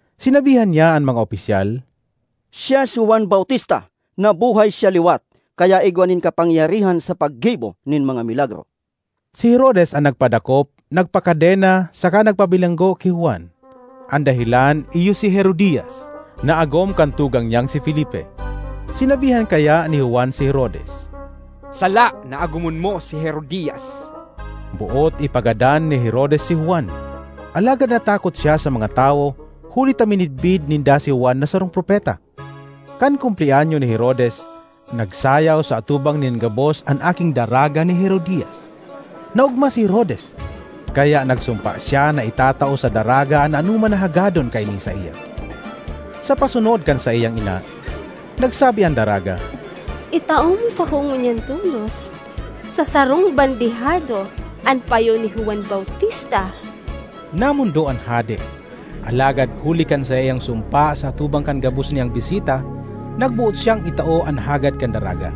Sinabihan niya an mga opisyal, “Siya si Juan Bautista; nabuhay siya liwat kaya igwa nin kapangyarihan sa paggibo nin mga milagro.” Si Herodes an nagpadakop, nagpakadena saka nagpabilanggo ki Juan. An dahelan iyo si Herodias, na agom kan tugang niyang si Felipe. Sinabihan kaya ni Juan si Herodes, “Sala na agomon mo si Herodias!” Boot ipagadan ni Herodes si Juan, alagad natakot siya sa mga tawo huli ta minidbid ninda si Juan na sarong propeta. Kan kumpleanyo ni Herodes, nagsayaw sa atubang nin gabos an aking daraga ni Herodias. Naogma si Herodes, kaya nagsumpa siya na itatao sa daraga an anoman na hagadon kaini saiya! Sa pasunod kan saiyang ina, nagsabi an daraga, “Itao mo sako ngunyan tolos sa sarong bandehado an payo ni Juan Bautista!” Namondo an hade, alagad huli kan saiyang sumpa sa atubang kan gabos niyang bisita, nagboot siyang itao an hagad kan daraga.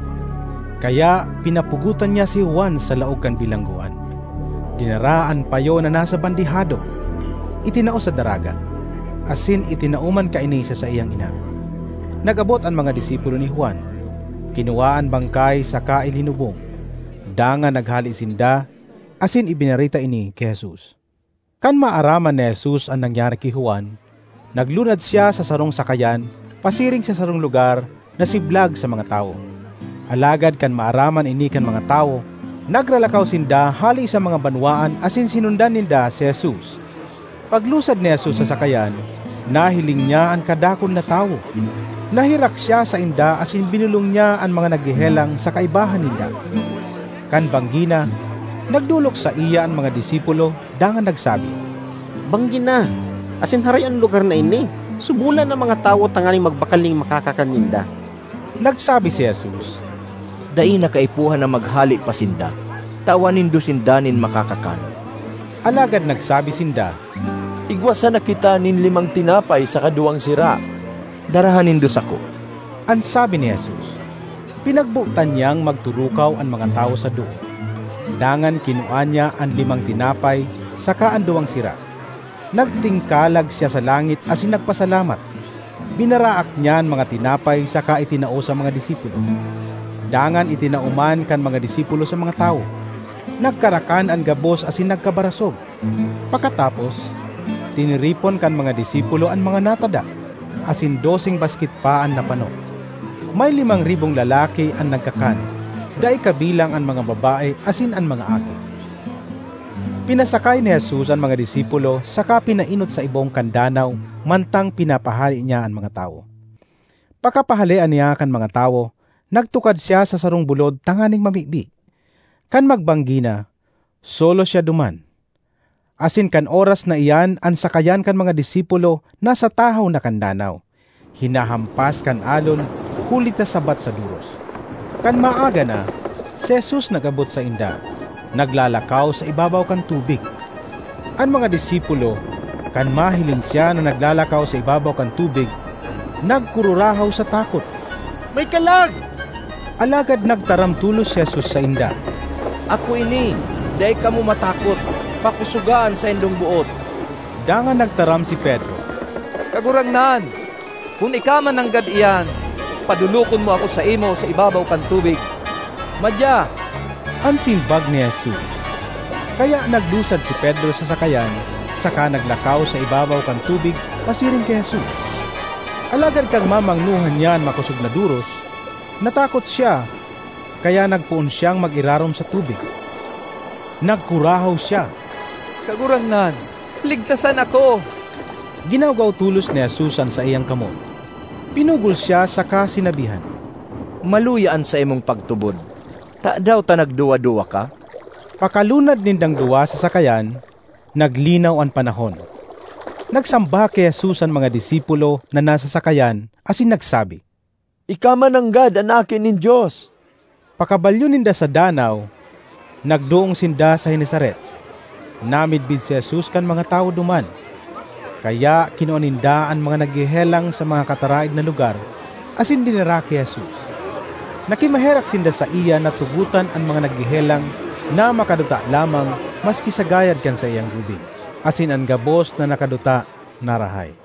Kaya pinapugotan niya si Juan sa laog kan bilanggoan. Dinara an payo na nasa bandehado, itinao sa daraga, asin itinao man kaini sa saiyang ina. Nag-abot an mga disipulo ni Juan, kinua an bangkay saka ilinubong. Dangan naghale sinda asin ibinareta ini ki Jesus. Kan maaraman ni Jesus an nangyari ki Juan, naglunad siya sa sarong sakayan pasiring sa sarong lugar na siblag sa mga tawo. Alagad kan maaraman ini kan mga tawo, nagralakaw sinda hale sa mga banwaan asin sinundan ninda si Jesus. Paglusad ni Jesus sa sakayan, nahiling niya an kadakul na tawo; naherak siya sainda asin binolong niya an mga naghehelang sa kaibahan ninda. Kan banggi na, nagdolok saiya an mga disipulo dangan nagsabi, “Banggi na, asin harayo an lugar na ini. Subolan na an mga tawo tanganing magbakal nin makakakan ninda.” Nagsabi si Jesus, “Dai na kaipuhan na maghale pa sinda; tawan nindo sinda nin makakakan.” Alagad nagsabi sinda, “Igwa sana kita nin limang tinapay saka duwang sira.” ”Daraha nindo sako,” an sabi ni Jesus. Pinagbotan niyang magturukaw an mga tawo sa doot. Dangan kinua niya an limang tinapay saka an duwang sira, nagtingkalag siya sa langit asin nagpasalamat. Binaraak niya an mga tinapay saka itinao sa mga disipulo; dangan itinao man kan mga disipulo sa mga tawo. Nagkarakan an gabos asin nagkabarasog. Pakatapos, tiniripon kan mga disipulo an mga natada, asin doseng basket pa an napano. May limang ribong lalaki an nagkakan, dai kabilang an mga babae asin an mga aki. Pinasakay ni Jesus an mga disipulo saka pinaenot sa ibong kan danaw mantang pinapahale niya an mga tawo. Pakapahalea niya kan mga tawo, nagtukad siya sa sarong bulod tanganing mamibi. Kan magbanggi na, solo siya duman; asin kan oras na iyan an sakayan kan mga disipulo nasa tahaw na kan danaw, hinahampas kan alon huli ta sabat sa doros. Kan maaga na, si Jesus nag-abot sainda, naglalakaw sa ibabaw kan tubig. An mga disipulo, kan mahiling siya na naglalakaw sa ibabaw kan tubig, nagkururahaw sa takot, “May kalag!” Alagad nagtaram tolos si Jesus sainda, “Ako ini! Dai kamo matakot! Pakosoga an saindong boot!” Dangan nagtaram si Pedro, “Kagurangnan, kun ika man nanggad iyan, padolokon mo ako saimo sa ibabaw kan tubig.” ”Madya!” an simbag ni Jesus. Kaya naglusad si Pedro sa sakayan saka naglakaw sa ibabaw kan tubig pasiring ki Jesus. Alagad kan mamangnohan niya an makosog na doros, natakot siya kaya nagpoon siyang mag-irarom sa tubig. Nagkurahaw siya, “Kagurangnan, ligtasan ako!” Ginawgaw tolos ni Jesus an saiyang kamot, pinugol siya saka sinabihan, “Maluya an saimong pagtubod! Tadaw ta nagduwa-duwa ka?” Pakalunad nindang duwa sa sakayan, naglinaw an panahon. Nagsamba ki Jesus an mga disipulo na nasa sakayan asin nagsabi, “Ika mananggad an Aki nin Dios!” Pakabalyo ninda sa danaw, nagdoong sinda sa Genesaret. Namidbid si Jesus kan mga tawo duman, kaya kinua ninda an mga naghehelang sa mga kataraed na lugar asin dinara ki Jesus. Nakimaherak sinda saiya na tugotan an mga naghehelang na makaduta lamang maski sa gayad kan saiyang gubing; asin an gabos na nakaduta narahay.